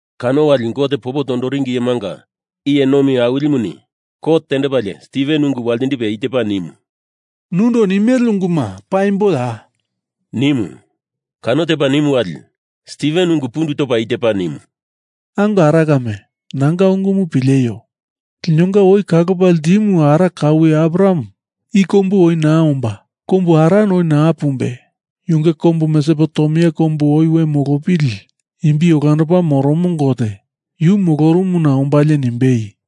Kano wali Gote popo toringi iyemanga iye nomi awilimuni kot tendepalie Stiven ungu waltindipe i tepa nimu, “Nundo i nimele unguma paimboya?” nimu. Kano tepa nimu wali Stiven ungu pundu topa i tepa nimu, “Ango ara kame nanga ungumu pileio. Linonga oi kalopa ltimu ara kaue Abraham i kombu oi naa omba kombu Haran oi naa pumbe yunge kombu Mesopotemia kombu oi we molopili imbi olandopa moromo Gote yu molorumuna ombalie nimbei,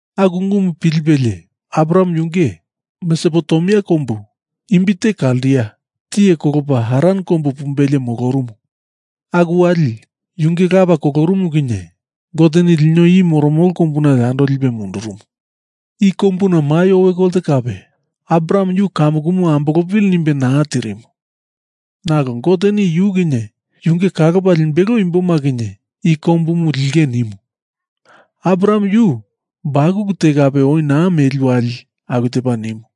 Aku ungumu pilipelie Abraham yunge Mesopotemia kombu imbite Kaldia tiye kolopa Haran kombu pumbelie molorumu. Aku wali yunge lapa kolorumu kinye Goteni lino i moromolo kombuna yando lipe mundurumu. I kombuna mai owe kolte kape Abraham yu kamukumu ambolopili nimbe naa tirimu. Nalo Goteni yu kinye yunge kalopa limbelo imboma kinye i kombumu linge nimu. Abraham yu bakulu te kape oi naa meli wali aku tepa nimu.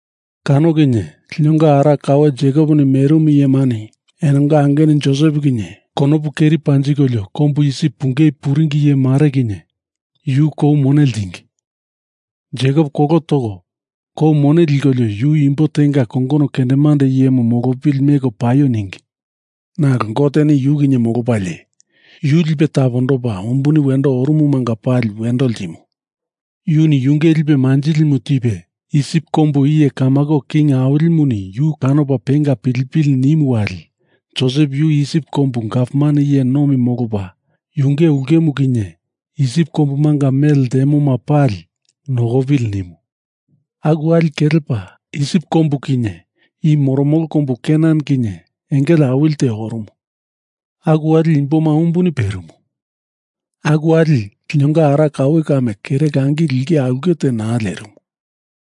Kano kinye linonga ara kaue Jekoponi merimu iyemani enonga angenu Josep kinye konopu keri panjikolio kombu Isip pungei puringi iye mare kinye yu kou mone ltingi. Jekop kolo toko kou mone likolio yu imbo tenga kongono kendemande iyemu molopili meko paio ningi. Nalo Goteni yu kinye molopalie, yu lipe tapondopa umbuni wendo orumumanga pali wendo ltimu. Yuni yunge lipe manjilimu tipe, Isip kombu iye kamako king awilimuni yu kanopa penga pilipili nimu wali Josep yu Isip kombu gavman iye nomi molopa yunge ulkemu kinye Isip kombumanga mele ltemoma pali nokopili nimu. Aku wali kelepa Isip kombu kinye i moromolo kombu Kenan kinye engele awili te orumu. Aku wali imboma umbuni perimu. Aku wali linonga ara kaue kame kere langi lingei aulke te naa lerimu.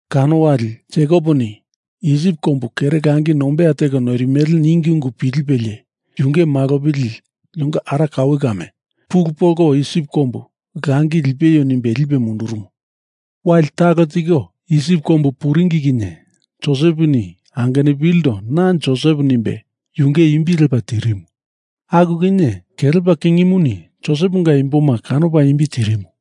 Kano wali Jekoponi Isip kombu kere langi nombeya teko noirimele ningi ungu pilipelie yunge malopili linonga ara kaue kame pulu polko Isip kombu langi lipeio nimbe lipe mundurumu. Wali talo tiko Isip kombu puringi kinye Joseponi angenupilindo na Josep nimbe yunge imbi lepa tirimu, aku kinye kelepa kingimuni Joseponga imboma kanopa imbi tirimu.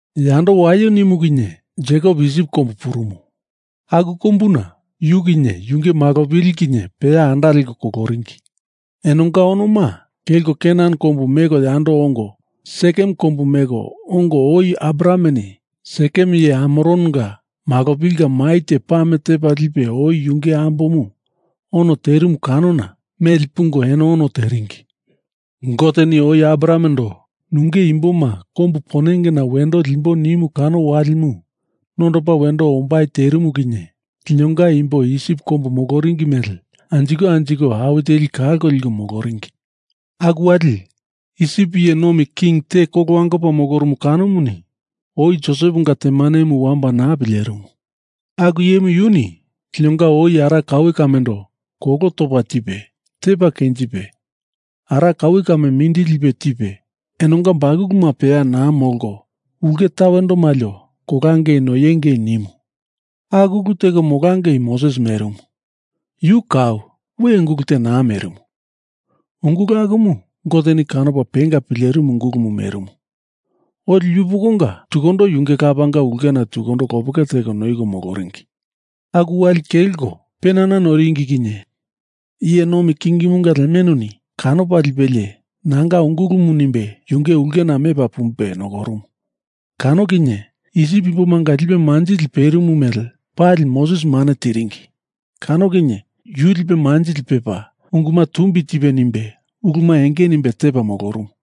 Yando waio nimu kinye Jekop Isip kombu purumu. Aku kombuna yu kinye yunge malopili kinye peya anda leko koloringi. Enonga onoma kelko Kenan kombu meko yando ongo Sekem kombu meko ongo oi Abrahameni Sekem iye Hamoronga malopilinga mai te pame tepa lipe oi yunge ambomu ono terimu kanona meli pungo eno ono teringi. Goteni oi Abrahamendo nunge imboma kombu ponengena wendo limbo nimu kano walimu nondopa wendo ombai terimu kinye linonga imbo Isip kombu moloringi mele anjiko anjiko awi teli kalko liko moloringi. Aku wali Isip iye nomi king te kolo wangopa molorumu kanomuni oi Joseponga temanemu wamba naa pilerimu. Aku iyemu yuni linonga oi ara kaue kamendo kolo topa tipe tepa kenjipe, ara kaue kame mindili lipe tipe enonga bakuluma peya naa molko ulke tawendo malio kolangei noiengei nimu. Aku ulu teko molangei Moses merimu. Yu kau we ungulu te naa merimu. Ungulu akumu Goteni kanopa penga pilerimu ungulumu merimu. Oli yupokonga tukundo yunge lapanga ulkena tukundo lopeke teko noiko moloringi. Aku wali kelko penana noiringi kinye iye nomi kingimunga lemenuni kanopa lipelie nanga ungulumu nimbe yunge ulkena mepa pumbe nokorumu. Kano kinye Isip imbomanga lipe manjili perimu mele pali Moses mane tiringi. Kano kinye yu lipe manjili pepa unguma tumbi tipe nimbe uluma enge nimbe tepa molorumu.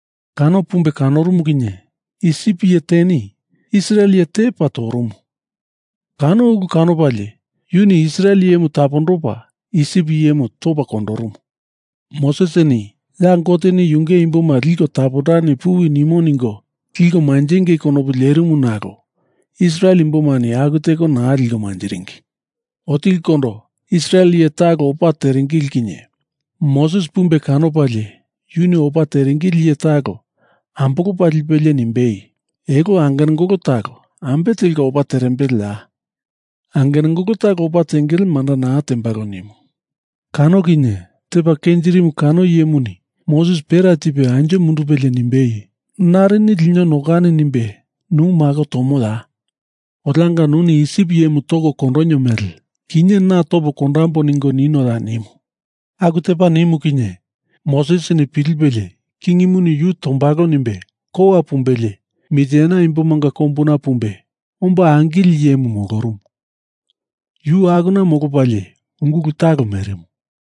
Kano pumbe kanorumu kinye Isip iye teni Israel iye te tepa torumu. Kano ulu kanopalie yuni Israel iyemu tapondopa Isip iyemu topa kondorumu. Mosesini ya Goteni yunge imboma liko tapondani puwi nimo ningo liko manjengei kondopu lerimu nalo Israel imbomani aku teko naa liko manjiringi. Otilikondo Israel iye talo opa teringili kinye Moses pumbe kanopalie yuni opa teringili iye talo ambolopa lipelie nimbei, ‘Elo angenangolo talo ambe telka opa terembele ya? Angenangolo talo opa tengele manda naa tembalo,’ nimu. Kano kinye tepa kenjirimu kano iyemuni Moses pera tipe anjo mundupelie nimbei, ‘Narini lino nokani nimbe nu mako tomoya? Olianga nuni Isip iyemu toko kondonio mele kinye na topo kondambo ningo ninoya?’ nimu. Aku tepa nimu kinye Mosesini pilipelie Kingimuni yu tombalo nimbe kowa pumbelie Mitiene imbomanga kombuna pumbe omba angili iyemu molorumu. Yu akuna molopalie ungulu talo merimu.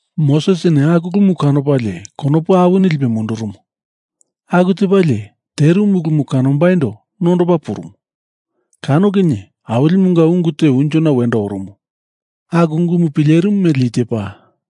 Mosesini aku ulumu kanopalie konopu awini lipe mundurumu. Aku tepalie terimu ulumu kanombaindo nondopa purumu. Kano kinye Awilimunga ungu te unjona wendo orumu. Aku ungumu pilerimu mele i tepa,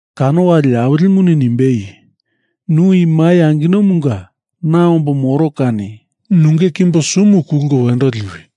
Kano wali Awilimuni nimbei, Nu i mai anginomunga na ombo moro kani nunge kimbo sumu kulko wendo liwi.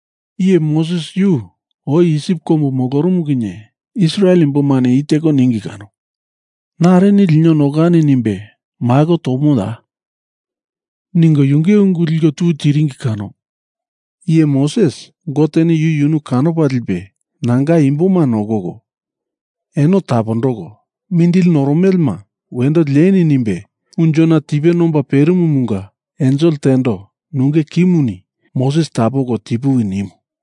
Iye Moses yu oi Isip kombu molorumu kinye Israel imbomani i teko ningi kano, ‘Narini lino nokani nimbe mako tomoya?’ ningo yunge ungu liko tu tiringi kano iye Moses Goteni yu yunu kanopa lipe nanga imboma nokoko, eno tapondoko mindili noromelema wendo lieni nimbe unjona tipe nomba perimumunga ensel tendo nunge kimuni Moses tapoko tipuwi nimu.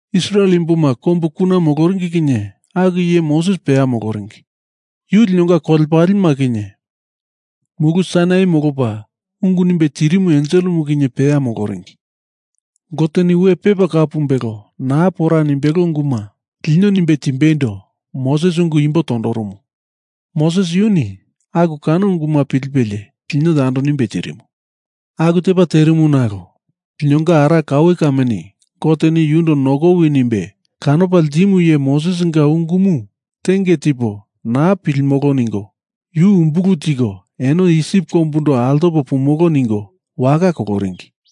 Israel imboma kombu kuna moloringi kinye aku iye Moses peya moloringi. Yu linonga kolepalema kinye Mulu Sainai molopa ungu nimbe tirimu enselemu kinye peya moloringi. Goteni we pepa kau pumbelo naa pora nimbelo unguma lino nimbe timbeindo Moses ungu imbo tondorumu. Moses yuni aku kano unguma pilipelie lino yando nimbe tirimu. Aku tepa terimu nalo linonga ara kaue kameni Goteni yundo nokowi nimbe kanopa ltimu iye Mosesinga ungumu tenge tipo naa pilimolo ningo yu umbulu tiko eno Isip kombundo altopo pamolo ningo waka koloringi.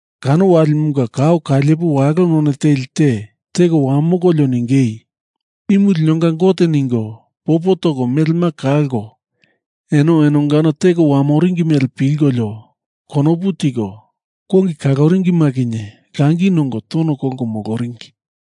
Kano walimunga kao kailepo walo none teli te teko wamokolio ningei, Imu linonga Gote ningo popo toko melema kalko, eno enongano teko wamoringi mele pilkolio konopu tiko kongi kaloringima kinye langi nongo tono kolko moloringi.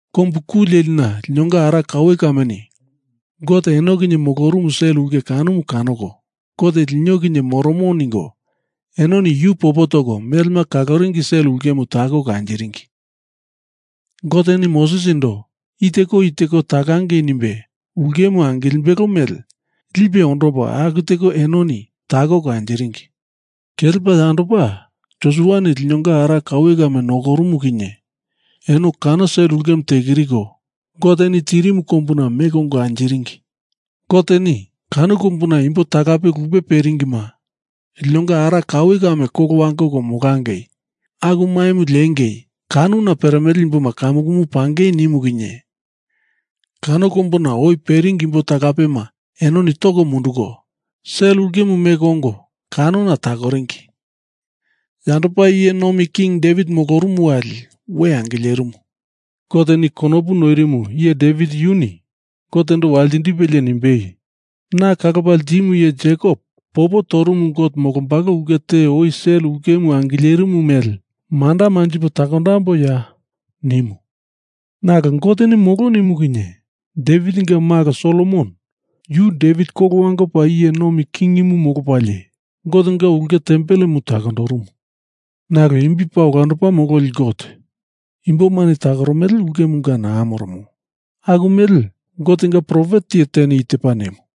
Kombu ku lelina linonga ara kaue kameni Gote eno kinye molorumu sel ulke kanomu kanoko Gote lino kinye moromo ningo enoni yu popo toko melema kaloringi sel ulkemu takoko anjiringi. Goteni Mosesindo i teko i teko takangei nimbe ulkemu angilimbelo mele lipe ondopa aku teko enoni takoko anjiringi. Kelepa yandopa Josuani linonga ara kaue kame nokorumu kinye eno kano sel ulkemu tekiriko, Goteni tirimu kombuna meko ongo anjiringi. Goteni kano kombuna imbo talape lupe peringima linonga ara kaue kame kolo wangoko molangei, aku maimu lengei kanona peremele imboma kamukumu pangei nimu kinye kano kombuna oi peringi imbo talapema enoni toko munduko, sel ulkemu meko ongo kanona takoringi, yandopa iye nomi king Devit molorumu wali we angilerimu. Goteni konopu noirimu iye Devit yuni Gotendo waltindipelie nimbei, ‘Na kalopa ltimu iye Jekop popo torumu Gote molombalo ulke te oi sel ulkemu angilerimu mele, manda manjipo takondamboiya?’ nimu. Nalo Goteni molo nimu kinye Devitinga malo Solomon yu Devit kolo wangopa iye nomi kingimu molopalie Gotenga ulke tempelemu takondorumu. Nalo imbi paa olandopa mololi Gote imbomani takoromele ulkemunga naa moromo. Aku mele, Gotenga profet iye teni i tepa nimu: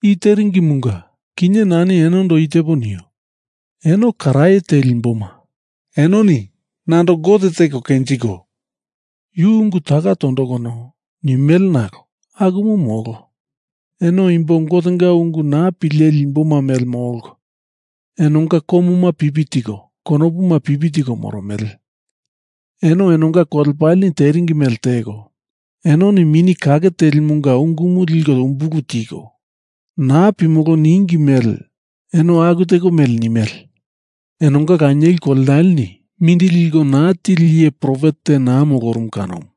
I teringimunga kinye nani enondo i tepo nio. Eno karaye teli imboma, enoni nando Gote teko kenjiko yu ungu taka tondokono, nimele nalo akumu molo. Eno imbo Gotenga ungu naa pileli imboma mele molko enonga komuma pipi tiko konopuma pipi tiko moromele. Eno enonga kolepaleni teringi mele teko, enoni Mini Kake Telimunga ungumu liko umbulu tiko naa pilimolo ningi mele eno aku teko mele nimele. Enonga lanieli kolenaleni mindili liko naa tili iye profet te naa molorumu kanomu.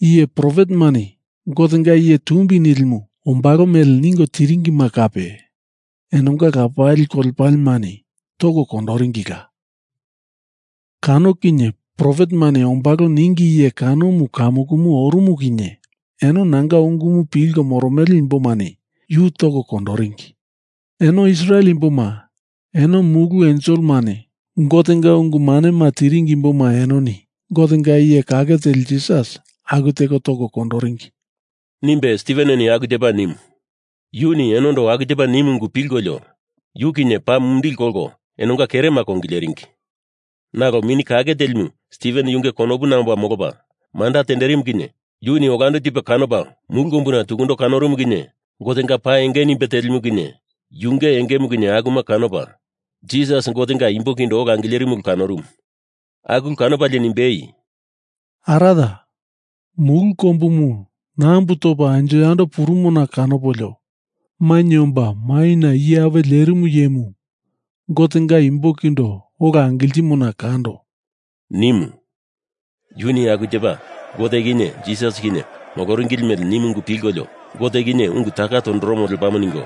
Iye profetemani Gotenga Iye Tumbi Nilimu ombalo mele ningo tiringima kape enonga lapali kolepalemani toko kondoringila. Kano kinye profetemani ombalo ningi iye kanomu kamukumu orumu kinye eno nanga ungumu pilko moromele imbomani yu toko kondoringi. Eno Israel imboma, eno mulu enselemani Gotenga ungu manema tiringi imboma, enoni Gotenga iye kake teli Jisas aku teko toko kondoringi,” nimbe Stiveneni aku tepa nimu. Yuni enondo aku tepa nimu ungu eno pilkolio yu kinye paa mumindili kolko enonga kerema kongileringi. Nalo Mini Kake Telimu Stiven yunge konopuna omba molopa manda tenderimu kinye yuni olando tipe kanopa mulu kombuna tukundo kanorumu kinye Gotenga pa enge nimbe telimu kinye yunge engemu kinye akuma kanopa, Jisas Gotenga imbo kindo ola angilerimu ulu kanorumu. Aku ulu kanopalie nimbei, “Araya, mulu kombumu nambu topa anjo yando purumona kanopolio mainye omba maina iye apuwe lerimu iyemu Gotenga imbo kindo ola angiltimona kando,” nimu. Yuni aku tepa Gote kinye Jisas kinye moloringili mele nimu ungu pilkolio, Gote kinye ungu taka tondoromo lepamo ningo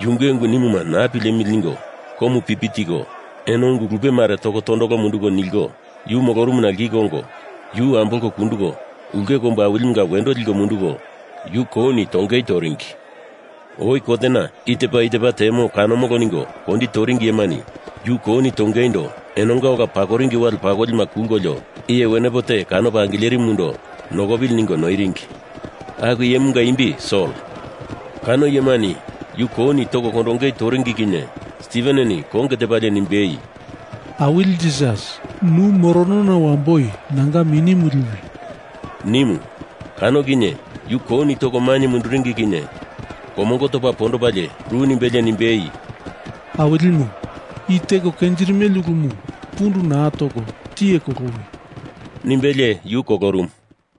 yunge ungu nimumu naa pilemili ningo komu pipi tiko eno ungu lupe mare toko tondolo munduko niliko yu molorumuna liko ongo yu ambolko kunduko ulke kombu awilimunga wendo liko munduko yu kouni tongei toringi. Oi kotena i tepa i tepa temo kanomolo ningo kondi toringi iyemani yu kouni tongeindo enonga ola pakoringi wale pakolima kulkolio iye wenepo te kanopa angilerimundo nokopili ningo noiringi. Aku iyemunga imbi Sol. Kano iyemani yu kouni toko kondongei toringi kinye Stiveneni konge tepalie nimbei, “Awili Jisas, nu moronona wamboi nanga minimu liwi,” nimu. Kano kinye yu kouni toko mainye munduringi kinye komongo topa pondopa ru nimbelie nimbei, “Awilimu i teko kenjirimele ulumu pundu naa toko tiye kolowi,” nimbelie yu kolorumu.